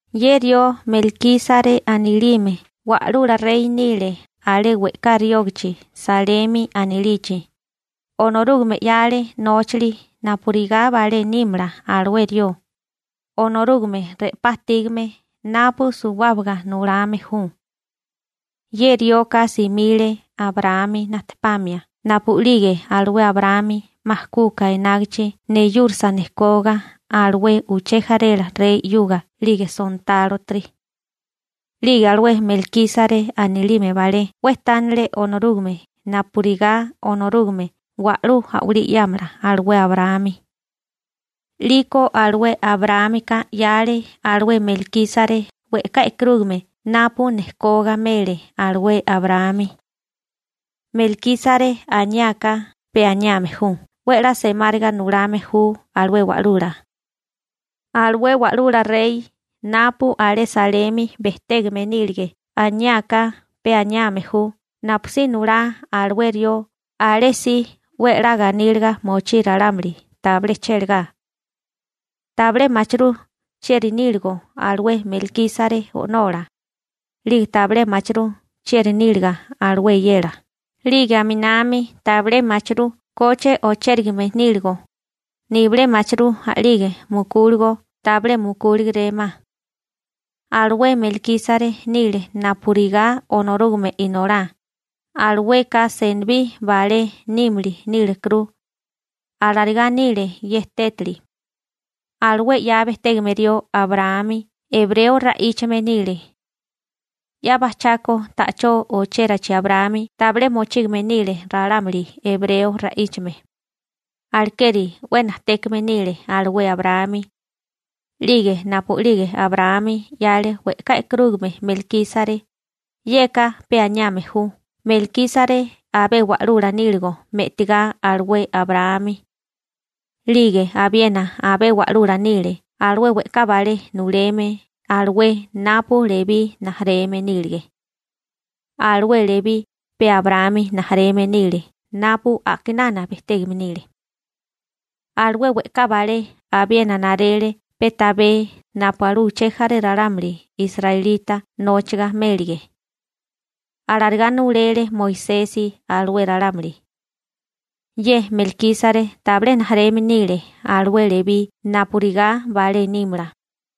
Ye rió Melkísare anilime wa'lula rey nile alé we'ká riógachi Salemi anilichi, Onorúgame 'yale nóchali napurigá balé nímala alué rió, Onorúgame re'pá ajtígame napu suwábaga nulame ju. Ye rioka simile Abraámi najtepamia napu'lige alué Abraámi 'ma kuka enágichi neyúrasa nejkoga alué uché jarela rey 'yuga 'lige sontálotiri. 'Lige alué Melkísare anilime balé 'we tánale Onorúgame napurigá Onorúgame wa'lú a'walí 'yámala alué Abraámi. 'Liko alué Abraámika 'yale alué Melkísare we'ká e'karúgame napu nejkoga mele alué Abraámi. Melkísare aniáká pe aniame ju «'we 'la semáriga nulame ju alué wa'lula.» Alué wa'lula rey napu alé Salemi bejtégame nílige aniáká pe aniame ju «napusí nulá alué rió alé si 'we 'la ganíliga mochí ralámuli, tabilé chélagá.» Tabilé machirú chieri níligo alué Melkísare o'nola, 'lige tabilé mochirú chieri níliga alué eyela, 'lige aminami tabilé machirú koche ochérigame níligo, nibilé machirú a'lige mukúligo tabilé mukúlegeré ma. Alué Melkísare nile napurigá Onorúgame Inolá, alueka senibí balé nímili nílekuru. Alarigá nile ye tétali. Alué 'ya bejtégame rió Abraámi ebreo ra'íchame nile. 'Ya bajchako ta'chó ochérachi Abraámi tabilé mochígame nile ralámuli ebreo ra'íchame. Alekeri 'we najtékame nile alué Abraámi, 'lige napu'lige Abraámi 'yale we'ká e'karúgame Melkísare, yeka pe aniame ju Melkísare abé wa'lula níligo me'tigá alué Abraámi. 'Lige abiena abé wa'lula nile alué we'ká balé nuleme alué napu Lebí rijimala nílige. Alué Lebí pe Abraámi rijimala nile napu a'kinana bejtégame nile. Alué we'ká balé abiena narele pe tabé napu alué uché jaré ralámuli israelita nóchiga mélige. Alarigá nulele Moisesi alué ralámuli. Ye Melkísare tabilé rijimala nile alué Lebí napurigá balé nímala,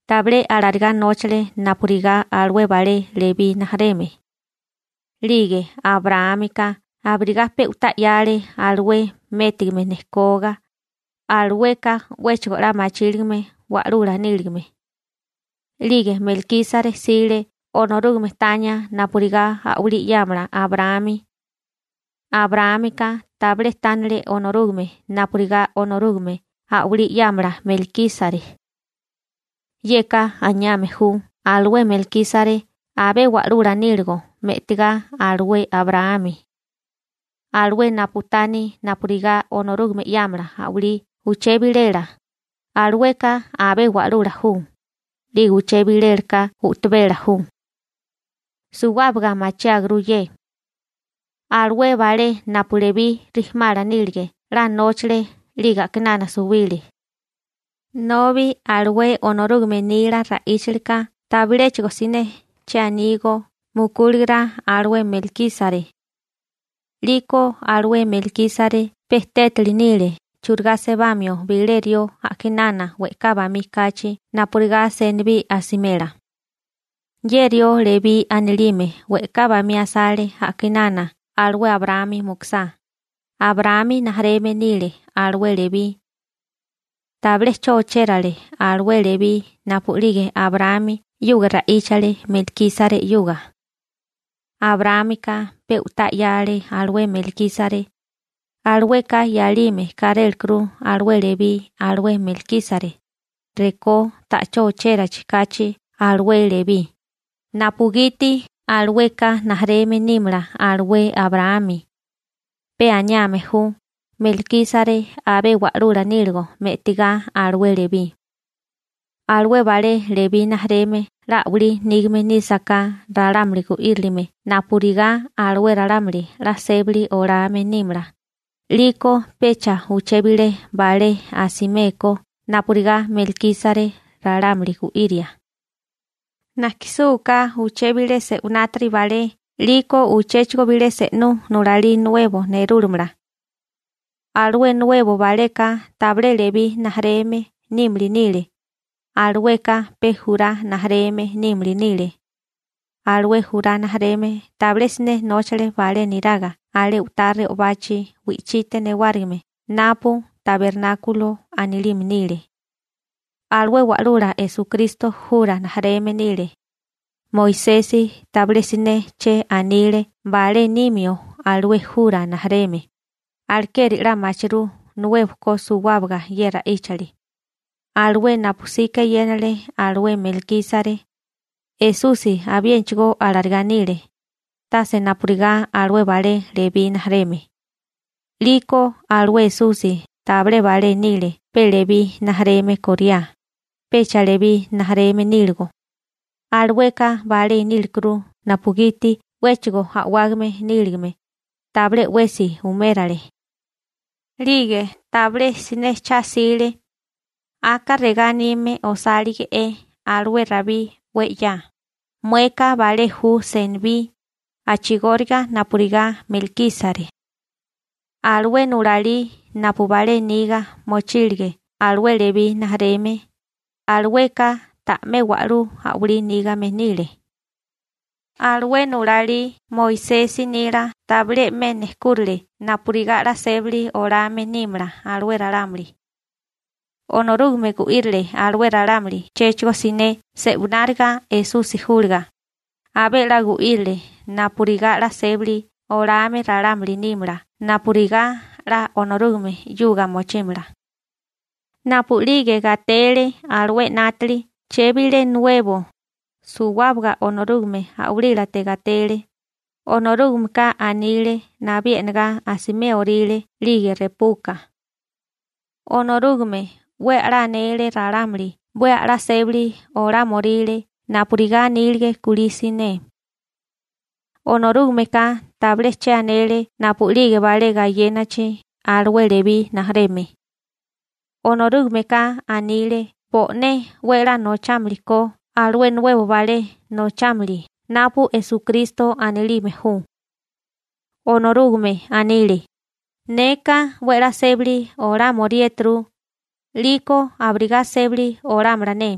tabilé alarigá nóchale napurigá alué balé Lebí rijimala. 'Lige Abraámika abirigá pe u'tá 'yale alué métigame nejkoga, alueka 'wéchigo 'la machíligame wa'lula níligame. 'Lige Melkísare 'sile Onorúgame tania napurigá a'walí 'yámala Abraámi. Abraámika tabilé tánale Onorúgame napurigá Onorúgame a'walí 'yámala Melkísare. Yeka anime ju alué Melkísare abé wa'lula níligo me'tigá alué Abraámi. Alué napu taní napurigá Onorúgame 'yámala a'walí uché bilela, alueka abé wa'lula ju, 'lige uché bilela ka u'tabela ju. Suwábaga machiáguru ye. Alué balé napu Lebí rijimala nílige 'la nóchale 'lige a'kinana suwile, nobi alué Onorúgame nila ra'íchalika tabiléchigo siné che anígó mukúligo alué Melkísare. 'Liko alué Melkísare pe tétali nile churigá sebamio bilé rió a'kinana we'ká bamí kachi napurigá senibí asimela. Ye rió Lebí anilime we'ká bamí asale a'kinana alué Abraámi mukusá, Abraámi rijimala nile alué Lebí. Tabilé 'cho ochérale alué Lebí napu'lige Abraámi 'yuga ra'íchale Melkísare 'yuga. Abraámika pe u'tá 'yale alué Melkísare, alueka 'yálime kárélekuru alué Lebí alué Melkísare, rekó ta'chó ochérachi kachi alué Lebí, napugiti alueka rijimala nímala alué Abraámi. Pe aniame ju Melkísare abé wa'lula níligo me'tigá alué Lebí. Alué balé Lebí rijimala 'la a'walí nígame nísaká ralámuli gu'írilime napurigá alué ralámuli 'la sébali olame nímala, 'liko pecha uché bilé balé asimé ko napurigá Melkísare ralámuli gu'iria. Najkisúká uché bilé se'winátiri balé 'liko uchéchigo bilé se'nú nulalí nuebo nerúlamala. Alué nuebo baleka tabilé Lebí rijimala nímili nile, alueka pe Jurá rijimala nímili nile. Alué Jurá rijimala tabilé siné nóchale balé niraga alé u'tá re'obachi wi'chite newárigime napu «tabernákulo» anilime nile. Alué Wa'lula Esukristo Jurá rijimala nile. Moisesi tabilé siné che anile balé nimio alué Jurá rijimala, alekeri 'la machirú nuebo ko suwábaga ye ra'íchali. Alué napu 'sika eyénale alué Melkísare, Esusi abiénachigó alarigá nile, tase napurigá alué balé Lebí rijimala. 'Liko alué Esusi tabilé balé nile pe Lebí rijimala kóriá, pecha Lebí rijimala níligo, alueka balé nílekuru napugiti 'wéchigo a'wágame níligame, tabilé 'wesi umérale. 'Lige tabilé siné cha'sile. Aka regá anime osálige'é alué Rabí 'we 'ya: Mueka balé ju senibí a'chigóriga napurigá Melkísare. Alué nulalí napu balé niga mochílige alué Lebí rijimala, alueka ta'mé wa'lú a'walí nígame nile. Alué nulalí Moisesi nila tabilé 'me nejkúrale napurigá 'la sébali olame nímala alué ralámuli. Onorúgame gu'írile alué ralámuli chéchigo siné se'wináriga Esusi júliga, abé 'la gu'írile napurigá 'la sébali olame ralámuli nímala napurigá 'la Onorúgame 'yuga mochímala. Napu'lige gatele alué 'nátali chebilé nuebo, suwábaga Onorúgame a'walílate gatele. Onorúgameka anile nabí e'negá asiméoríle 'lige repuka. Onorúgame 'we a'lá anele ralámuli 'we a'lá sébali olámioríle napurigá anílige kulí siné. Onorúgameka tabilé che anele napu'lige balé gayénichi alué Lebí rijimala. Onorúgameka anile bo'né 'we 'la nochámili ko alué nuebo balé nochámili napu Esukristo anilime ju. Onorúgame anile: Neka 'we 'la sébali olámoriéturu, 'liko abirigá sébali olámala ne.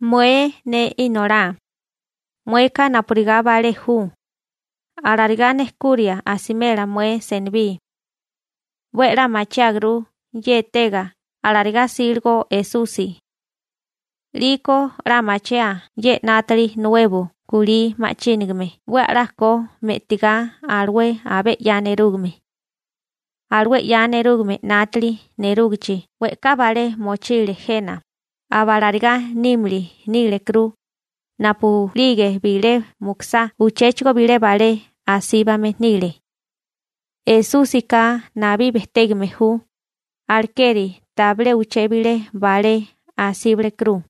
Mué ne Inolá, mueka napurigá balé ju, alarigá nejkuria asimela mué senibí. 'We a'lá machiáguru ye etega alarigá 'síligo Esusi. 'Liko 'la machiáa ye 'nátili nuebo kulí ma'chínigame 'we a'lá ko me'tigá alué abé 'ya nerúgame. Alué 'ya nerúgame 'nátili nerúgichi we'ká balé mochile jena, aba alarigá nímili nílekuru, napu'lige bilé mukusá uchéchigo bilé balé asíbame nile. Esúsika nabí bejtégame ju, alekeri tabilé uché bilé balé asíbalekuru.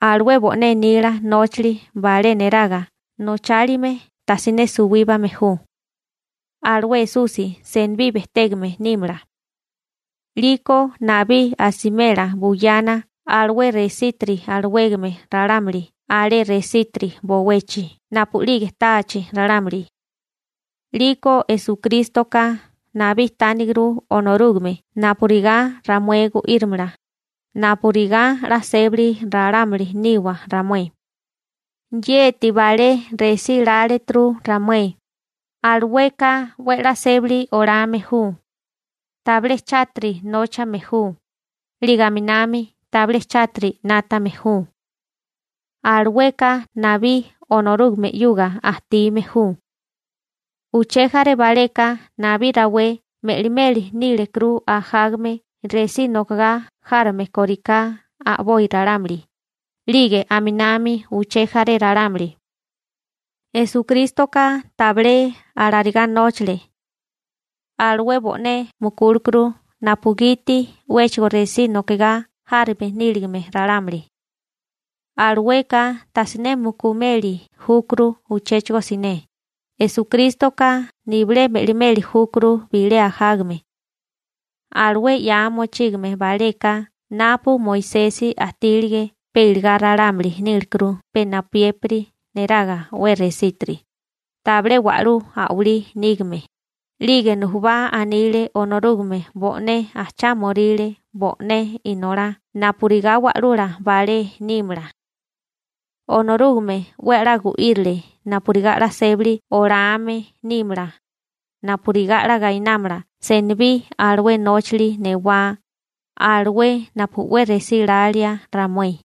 Alué bo'né nila nóchali balé neraga nochálime tajsiné suwíbame ju. Alué Esusi senibí bejtégame nímala. 'Liko nabí asimela buyana alué resítiri alawégame ralámuli alé resítiri bowechi napu'lige táachi ralámuli. 'Liko Esukrístoka nabí tániguru Onorúgame napurigá ramué gu'írimala, napurigá 'la sébali ralámuli niwa ramué. Yeti balé resí láleturu ramué. Alueka 'we 'la sébali olame ju. Tabilé chátiri nóchame ju, 'lige aminami tabilé chátiri 'nátame ju. Alueka nabí Onorúgame 'yuga ajtime ju. Uché jaré baleka nabí rawé me'limeli nílekuru ajágame resí nokigá járame kóriká a'boi ralámuli, 'lige aminami uché jaré ralámuli. Esukrístoka tabilé alarigá nóchale. Alué bo'né mukúlekuru napugiti 'wéchigo resí nokigá járame níligame ralámuli. Alueka tajsiné mukumeli júkuru uchéchigo siné, Esukrístoka nibilé me'limeli júkuru bilé ajágame. Alué 'ya mochígame baleka napu Moisesi ajtílige pe iligá ralámuli nílekuru pe napuyépiri neraga 'we resítiri, tabilé wa'lú a'walí nígame, 'lige nujubá anile Onorúgame bo'né ajchámoríle bo'né Inolá napurigá wa'lula balé nímala. Onorúgame 'we a'lá gu'írile napurigá 'la sébali olame nímala, napurigá 'la gainámala senibí alué nóchali newá, alué napu 'we resí lalía ramué.